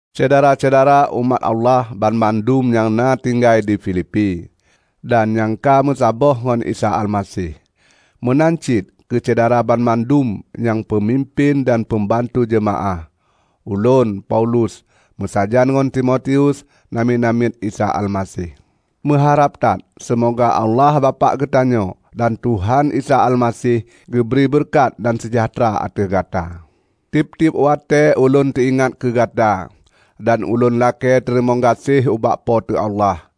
Syedara-syedara umat Allah banmandum nyang na tinggai di Filipi, dan nyang ka meusaboh ngon Isa Almaseh. Meunan cit keu Syedara banmandum nyang peumimpén dan peumbantu jeumaáh! Ulôn, Paulus, meusajan ngon Timotius, namiet-namiet Isa Almaseh, meuharab that seumoga Allah Bapak geutanyoe dan Tuhan Isa Almaseh geubri beureukat dan seujahteura ateueh gata. Tieb-tieb watée ulôn teuingat keu gata, dan ulôn lakée teurimong gaséh ubak Po teu Allah.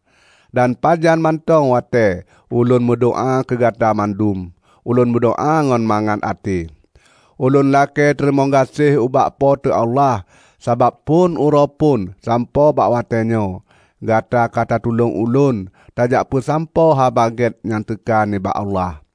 Dan pajan mantong watée ulôn meudoá keu Gata mandum, ulôn meudoá ngon mangat até. Ulôn lakée teurimong gaséh ubak Po teu Allah sabab phon uroe phon sampoe bak watée nyoe, gata ka tatulông ulôn tajak peusampoe Haba Gét nyang teuka nibak Allah.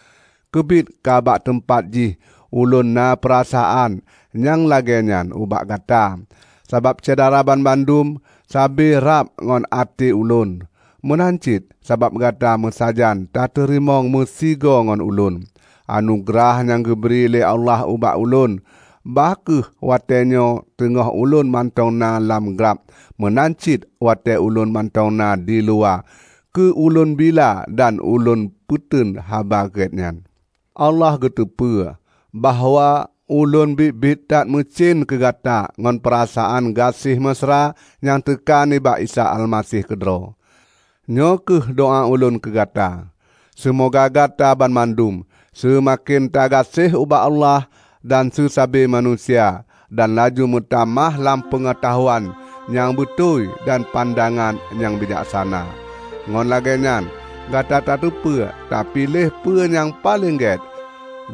Keubiet ka bak teumpat jih ulôn na peurasaan nyang lagée nyan ubak gata, sabab Syedara banmandum sabe rab ngon até ulôn. Meunan cit sabab gata meusajan tateurimong meusigoe ngon ulôn, anugeurah nyang geubri lé Allah ubak ulôn; bah kheueh watée nyoe teungoh ulôn mantong na lam glab meunan cit watée ulôn mantong na diluwa keu ulôn bila dan ulôn peuteun Haba Gét nyan. Allah geuteupeue bahwa ulôn biet-biet that meucen keu gata ngon peurasaan gaséh meusra nyang teuka nibak Isa Almaseh keudroe. Nyoe kheueh doá ulôn keu gata: seumoga gata banmandum seumaken tagaséh ubak Allah dan seusabe manusia dan laju meutamah lam peungeutahuan nyang beutôi dan pandangan nyang bijaksana. Ngon lagée nyan gata tateupeue tapiléh peue nyang paleng gét,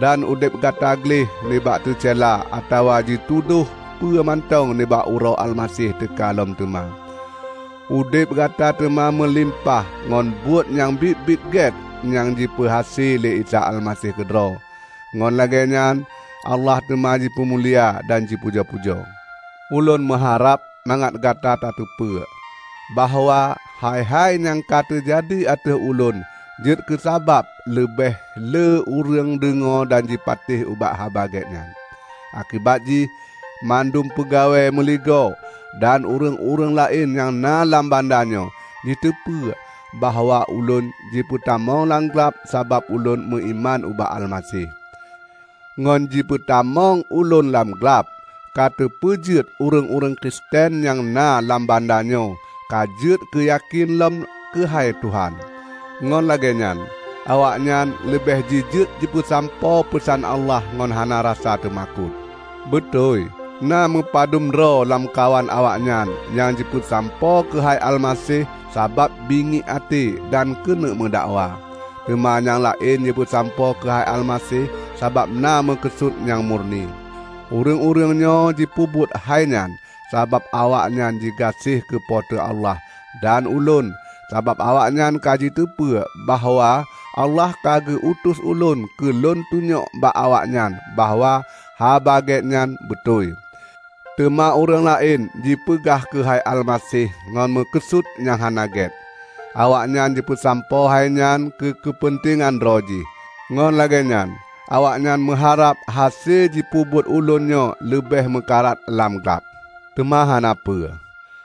dan udeb gata gleh nibak teucela atawa jitudôh peue mantong nibak uroe Almaseh teuka lom teuma. Udeb gata teuma meulimpah ngon buet nyang biet-biet gét nyang jipeuhase lé Isa Almaseh keudroe; ngon lagée nyan Allah teuma jipeumulia dan jipujoe-pujoe. Ulôn meuharab mangat gata tateupeue, bahwa hai-hai nyang ka teujadi ateueh ulôn jeuet keusabab leubeh le ureuëng deungoe dan jipatéh ubak Haba Gét nyan. Akibat jih, mandum peugawée meuligoe dan ureuëng-ureuëng laén nyang na lam banda nyoe jiteupeu bahwa ulôn jipeutamong lam glab sabab ulôn meuiman ubak Almaseh. Ngon jipeutamong ulôn lam glab ka teupeujeuet ureuëng-ureuëng Kristen nyang na lam banda nyoe ka jeuet keu yakén lom keuhai Tuhan, ngon lagée nyan awaknyan leubeh jijeuet jipeusampoe peusan Allah ngon hana rasa teumakot. Beutôi na meupadum droe lamkawan awaknyan nyang jipeusampoe keuhai Almaseh sabab bingiek até dan keuneuk meudakwa, teuma nyang laén jipeusampoe keuhai Almaseh sabab na meukeusut nyang murni. Ureuëng-ureuëng nyoe jipeubuet hai nyan sabab awaknyan jigaséh keu Po teu Allah dan ulôn, sabab awaknyan ka jiteupeu bahwa Allah ka geu-utus ulôn keu lôn tunyok bak awaknyan bahwa Haba Gét nyan beutôi. Teuma ureuëng laén jipeugah keuhai Almaseh ngon meukeusut nyang hana gét; awaknyan jipeusampoe hainyan keu keupeuntengan droe jih. Ngon lagée nyan awaknyan meuharab hase jipeubuet ulôn nyoe leubeh meukarat lam glab. Teuma hana peue!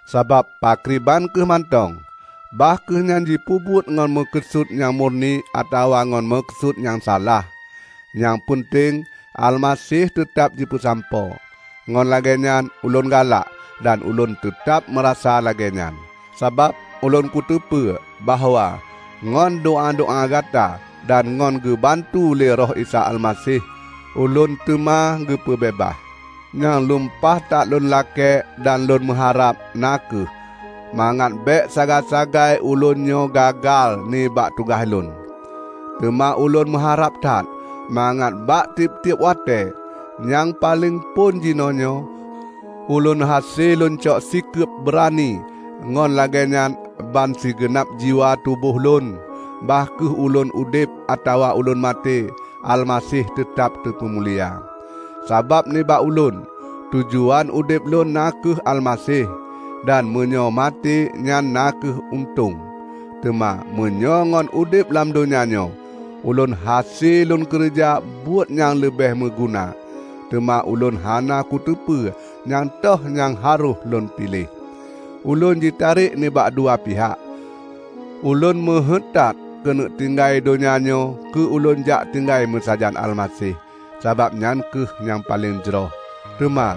Sabab pakriban kheueh mantong, bah kheueh nyan jipeubuet ngon meukeusut nyang murni atawa ngon meukeusut nyang salah, nyang peunteng Almaseh teutab jipeusampoe; ngon lagée nyan ulôn galak. Dan ulôn teutab meurasa lagée nyan, sabab ulôn kuteupeu bahwa ngon doá-doá gata dan ngon geubantu lé Roh Isa Almaseh, ulôn teuma geupeubeubaih. Nyang lumpah that lôn lakée dan ulôn meuharab na kheueh mangat bék sagai-sagai ulôn nyoe gagai nibak tugaih lôn. Teuma ulôn meuharab that mangat bak tieb-tieb watée, nyang paleng phon jinoenyoe, ulôn hase lôn cok sikeub beurani ngon lagée nyan bansigeunab jiwa tuboh lôn -- bah kheueh ulôn udeb atawa ulôn maté -- Almaseh teuteb teupeumulia. Sabab nibak ulôn, tujuan udeb lôn na kheueh Almaseh! Dan meunyoe maté nyan na kheueh untông. Teuma meunyoe ngon udeb lam donya nyoe, ulôn hase lôn keureuja buet nyang leubeh meuguna, teuma ulôn hana kuteupeu nyang toh nyang harôh lôn piléh. Ulôn jitarek nibak dua pihak. Ulôn meuheuét that keuneuk tinggai donya nyoe keu ulôn jak tinggai meusajan Almaseh, sabab nyan kheueh nyang paleng jroh; teuma,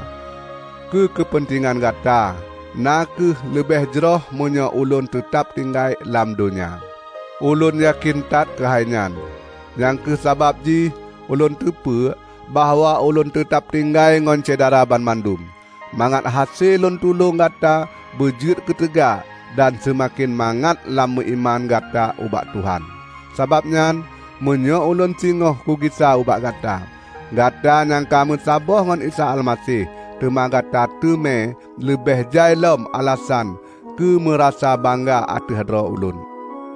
keu keupeuntengan gata, na kheueh leubeh jroh meunyoe ulôn teutab tinggai lam donya. Ulôn yakén that keuhai nyan. Nyang kheueh sabab jih ulôn teupeu bahwa ulôn teutab tinggai ngon Syedara banmandum, mangat hase lôn tulông gata beujeuet keuteuga dan seumaken mangat lam meuiman gata ubak Tuhan. Sabab nyan, meunyoe ulôn singoh kugisa ubak gata, gata nyang ka meusaboh ngon Isa Almaseh teuma gata teumé leubeh jai lom alasan keumeurasa bangga ateueh droe ulôn.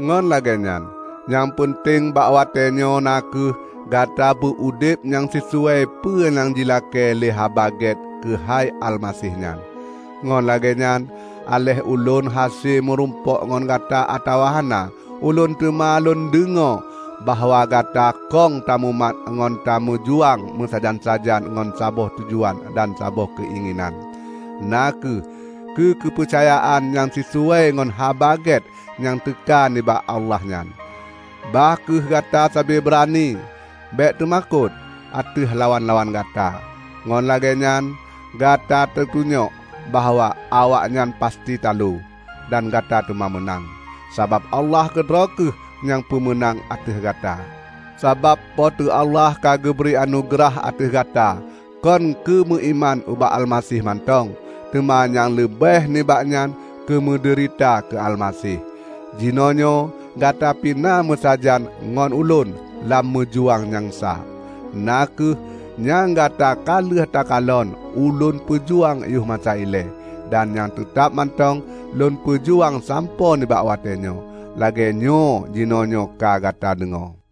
Ngon lagée nyan, nyang peunteng bak watée nyoe na kheueh gata beu udeb nyang sisuai peue nyang jilakée lé Haba Gét keuhai Almaseh nyan. Ngon lagée nyan, aléh ulôn hase meurumpok ngon gata atawa hana, ulôn teuma lôn deungoe bahwa gata kong tamumat ngon tameujuang meusajan-sajan ngon saboh tujuan dan saboh keuinginan; na kheueh keu keupeucayaan nyang sisuwai ngon Haba Gét nyang teuka nibak Allah nyan. Bah kheueh gata sabe beurani; bék teumakot ateueh lawan-lawan gata. Ngon lagée nyan gata tatunyok bahwa awaknyan pasti taloe, dan gata teuma meunang, sabab Allah keudroe kheueh nyang peumeunang ateueh gata. Sabab Po teu Allah ka geubri anugeurah ateueh gata kon keumeuiman ubak Almaseh mantong, teuma nyang leubeh nibak nyan keumeudeurita keu Almaseh. Jinoenyoe gata pi na meusajan ngon ulôn lam meujuang nyang sa; na kheueh nyang gata ka lheueh takalon ulôn peujuang yoh masa ilée, dan nyang teutab mantong lôn peujuang sampoe nibak watée nyoe, lagée nyoe jinoenyoe ka gata deungoe.